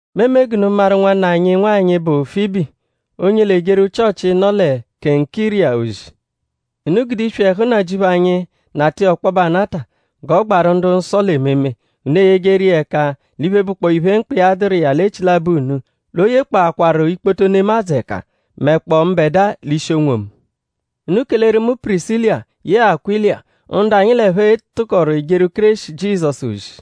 Mu eme g'unu maru nwanna anyi nwanyị, bụ Fibi; onye l'ejeru Chịochi, nọ lẹ Kenkiriya ozi. Unu gude iswi ẹhu Nnajịuphu anyi nata iya ọkpobe anata g'ọ gbaru ndu-nsọ l'ememe; unu eyejeru iya ẹka l'iphe, bụkpoo iphe, mkpa iya dụru iya l'echilabọ unu; l'o yekpọakwaru ikpoto nemadzụ ẹka; mẹkpoo mbẹdua l'ishi onwomu. Unu keleru mu Pirisila yẹe Akwịla; ndu anyi l'ẹphe tụkoru ejeru Kéreshi Jizọsu ozi;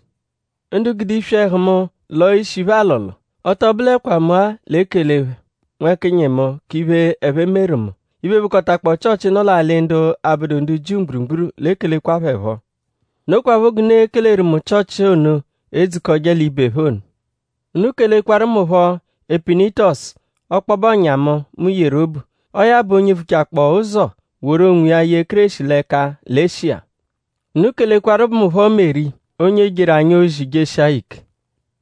ndu gude iswi ẹhu mu lọo ishi phẹ alọlo. Ọ tọ bụlekwa mu-a l'ekele phẹ nwẹkinyi mu k'iphe, ẹphe meru mu. Iphe, bụkotakpoo Chịochi, nọ l'alị ndu abụdu ndu Jiu mgburugburu l'ekelekwa phẹ phọ. Nokwaphọ g'unu e-keleru mu Chịochi ono, edzukọje l'ibe phẹ ono. Unu kelekwaru mu phọ Epenitọsu; ọkpobe ọ̀nyà mu, mu yeru obu. Ọo ya bụ onye vuchakpọo ụzo woru onwiya ye Kéreshi l'ẹka lẹ Eshiya. Unu kelekwaru mu phọ Meri; onye jeru anyi ozi jeshia ya ike.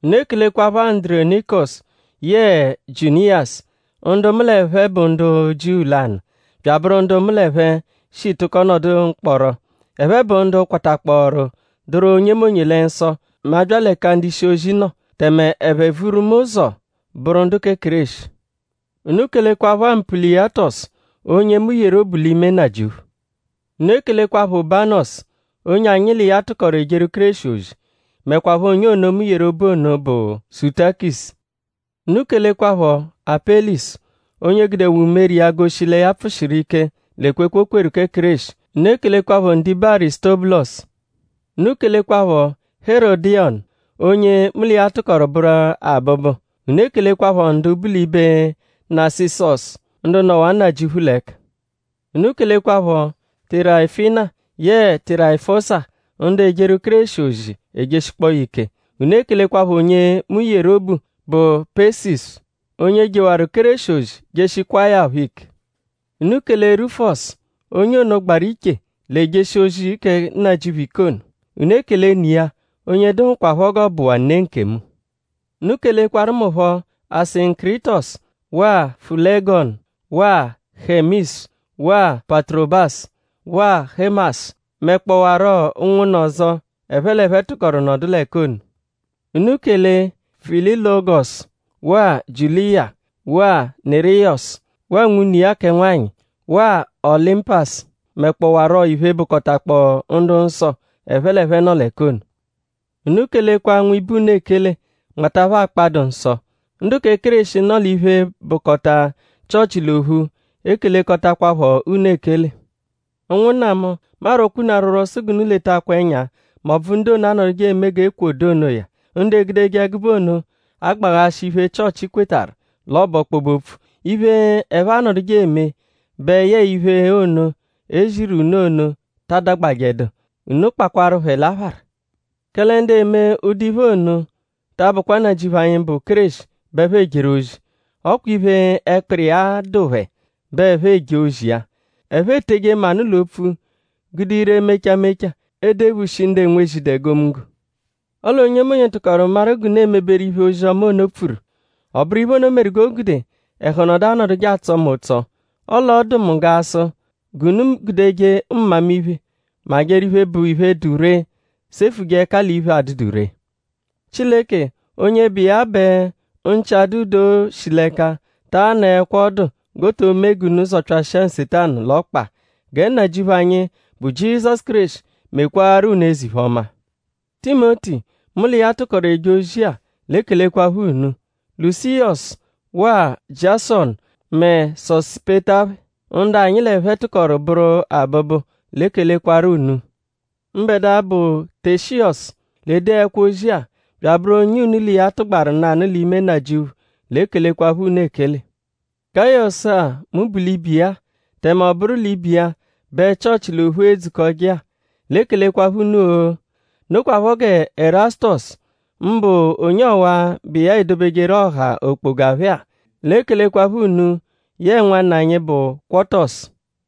Unu ekelekwaphọ Andurọnikosu yẹe Jiuniyasu; ndu mu l'ẹphe bụ ndu Jiu lanụ bya abụru ndu mu l'ẹphe shi tụko nọdu mkpọro. Ẹphe bụ ndu kwatakpọoru dụru onyemonye lẹ nsọ mẹ a -bya l'ẹka ndu-ishi-ozi nọ; tẹme ẹphe vuru mu ụzo bụru ndu kẹ Kéreshi. Unu kelekwaphọ Ampuliyatọsu; onye mu yeru obu l'ime Nnajịuphu. Unu ekelekwaphọ Ubanọsu; onye anyi l'iya tụkoru ejeru Kéreshi ozi; mẹkwapho onye ono, mu yeru obu ono, bụ Sutakisu. Unu kelekwaphọ Apẹlisu; onye gudewaa umere iya goshi lẹ ya pfụ-shiru ike l'ekwekwe, o kweru kẹ Kéreshi. Unu ekelekwaphọ ndibe Arisutọbulosu. Unu kelekwaphọ Herọdiyonu onye mu l'iya tụkoru bụru abụbu. Unu ekelekwaphọ ndu bu l'ibe Nasịsosu; ndu nọwaa Nnajịuphu l'ẹka. Unu kelekwaphọ Tirayifina yẹe Tirayifọsa ndu ejeru Kéreshi ozi ejeshikpọo ya ike. Unu ekelekwaphọ onye mu yeru obu, bụ Pesisu; onye jewaru Kéreshi ozi jeshikwaa ya phọ ike. Unu kele Rufọsu onye ono, gbaru iche l'ejeshi ozi kẹ Nnajịuphu ike ono. Unu ekele ne iya; onye dụhukwapho g'ọ bụwaa ne nkemu. Unu kelekwaru mu phọ Asinkiritọsu; waa Fulẹgonu; waa Hemisu; waa Paturobasu; waa Hẹmasu; mẹkpowaro ụnwunna ọzo, ẹphe l'ẹphe tụkoru nọdu l'ẹka ono. Unu kele Fịlologosu; waa Jiuliya; waa Niriyọsu; waa nwune iya kẹ nwanyị; waa Ọlimpasu; mẹkpowaro iphe, bụkotakpoo ndu-nsọ, ẹphe l'ẹphe nọ l'ẹka ono. Unu kelekwa nwibe unu ekele; nmata phẹ akpa, dụ nsọ. Ndu kẹ Kéreshi, nọ l'iphe, bụkota Chịochi l'ophu ekelekọtakwapho unu ekele. Ụnwunna mu; mu arwọkwa unu arwọrwo sụ g'unu letakwa ẹnya m'ọbvu ndu ono, anọduje eme g'ékwò dụ onoya; ndu egudeje ẹgube ono agbaghashị iphe, Chịochi kwetarụ l'ọ bụ ọkpobe-opfu. Iphe, ẹphe anọduje eme bẹ yẹe iphe ono, e ziru unu ono ta adagbajẹdu. Unu kpakwaru phẹ l'aphara. Kẹle ndu eme ụdu iphe ono ta abụkwa Nnajịuphu anyi, bụ Kéreshi bẹ ẹphe ejeru ozi; ọ kwa iphe, ẹkpiri iya dụ phẹ bẹ ẹphe eje ozi iya. Ẹphe eteje manụ l'opfu; gude ire mecha mecha edephushi ndu enwezidu egomunggo. Ọle onyemonye tụkoru maru g'unu emeberu iphe, ozi-ọma ono pfuru. Ọ bụru iphe ono meru g'o gude ẹhu nọdu anọduje atsọ mu ụtso. Ọle ọ dụ mu g'a sụ g'unu gudeje mmamiphe majẹru iphe, bụ iphe, dụ ree; sefuje ẹka l'iphe, adụdu ree. Chileke onye bụ iya bẹ nchị-adụ-doo shi l'ẹka taa nọekwa ọdu g'o to mee g'unu zọpyashia Nsetanu l'ọkpa. Gẹ Nnajịuphu anyi, bụ Jizọsu Kéreshi mekwaaru unu eze-iphe-ọma. Timoti, mu l'iya tụkoru eje ozi-a; l'ekelekwaphọ unu. Lusiyọsu; waa Jiasọnu; mẹ Sosipeta phẹ; ndu anyi l'ẹphe tụkoru bụru abụbu l'ekelekwarọ unu. Mbẹdua, bụ Teshiyọsu, l'ede ẹkwo-ozia; bya abụru onye unu l'iya tụgbaru nanụ l'ime Nnajịuphu l'ekelekwaphọ unu ekele. Gayọsu-a, mu bu l'ibe iya-a; tẹme ọ bụru l'ibe iya bẹ Chịochi l'ophu edzukọje-a; l'ekelekwaphọ unu-o! Nokwaphọ gẹ Ẹrasutosu; mbụ onye ọwa-a, bụ iya edobejeru ọha okpoga phẹ-a; l'ekelekwaphọ unu yẹe nwanna anyi, bụ Kwọtosu.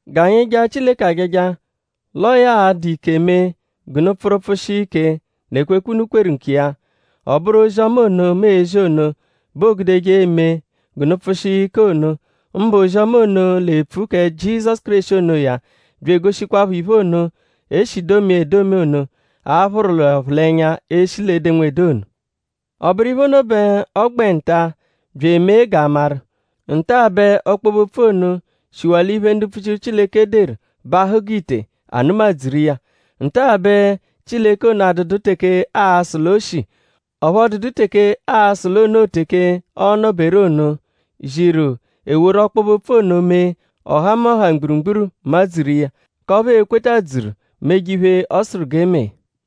G'anyi jaa Chileke ajaja; l'ọo ya l'a-dụ ike mee g'unu pfụru pfụshia ike l'ekwekwe, unu kweru nkiya. Ọ bụru ozi-ọma ono, mu ezi ono bẹ oogudeje eme g'unu pfụshia ike ono; mbụ ozi-ọma ono, l'epfu kẹ Jizọsu Kéreshi onoya; bya egoshikwaphọ iphe ono, e shi domia edomi ono, a phụru l'ọphulenya eshi l'edenwede ono. Ọ bụru iphe ono bẹ ọ gbẹ nta-a bya emee g'a maru. Nta-a bẹ ọkpobe-opfu ono shiwaa l'iphe, ndu mpfuchiru Chileke deru bahụ g'ite; a nụma-dzuru iya. Nta-a bẹ Chileke ono adụdu teke aa-sụ l'o shi; ọphu ọ dụdu teke aa-sụ l'o noo teke ọono-beru ono; ziru e woru ọkpobe-opfu ono mee; ọhamoha mgburugburu madzuru iya; k'ọphu ee-kwetadzuru meje iphe, ọ sụru g'e mee.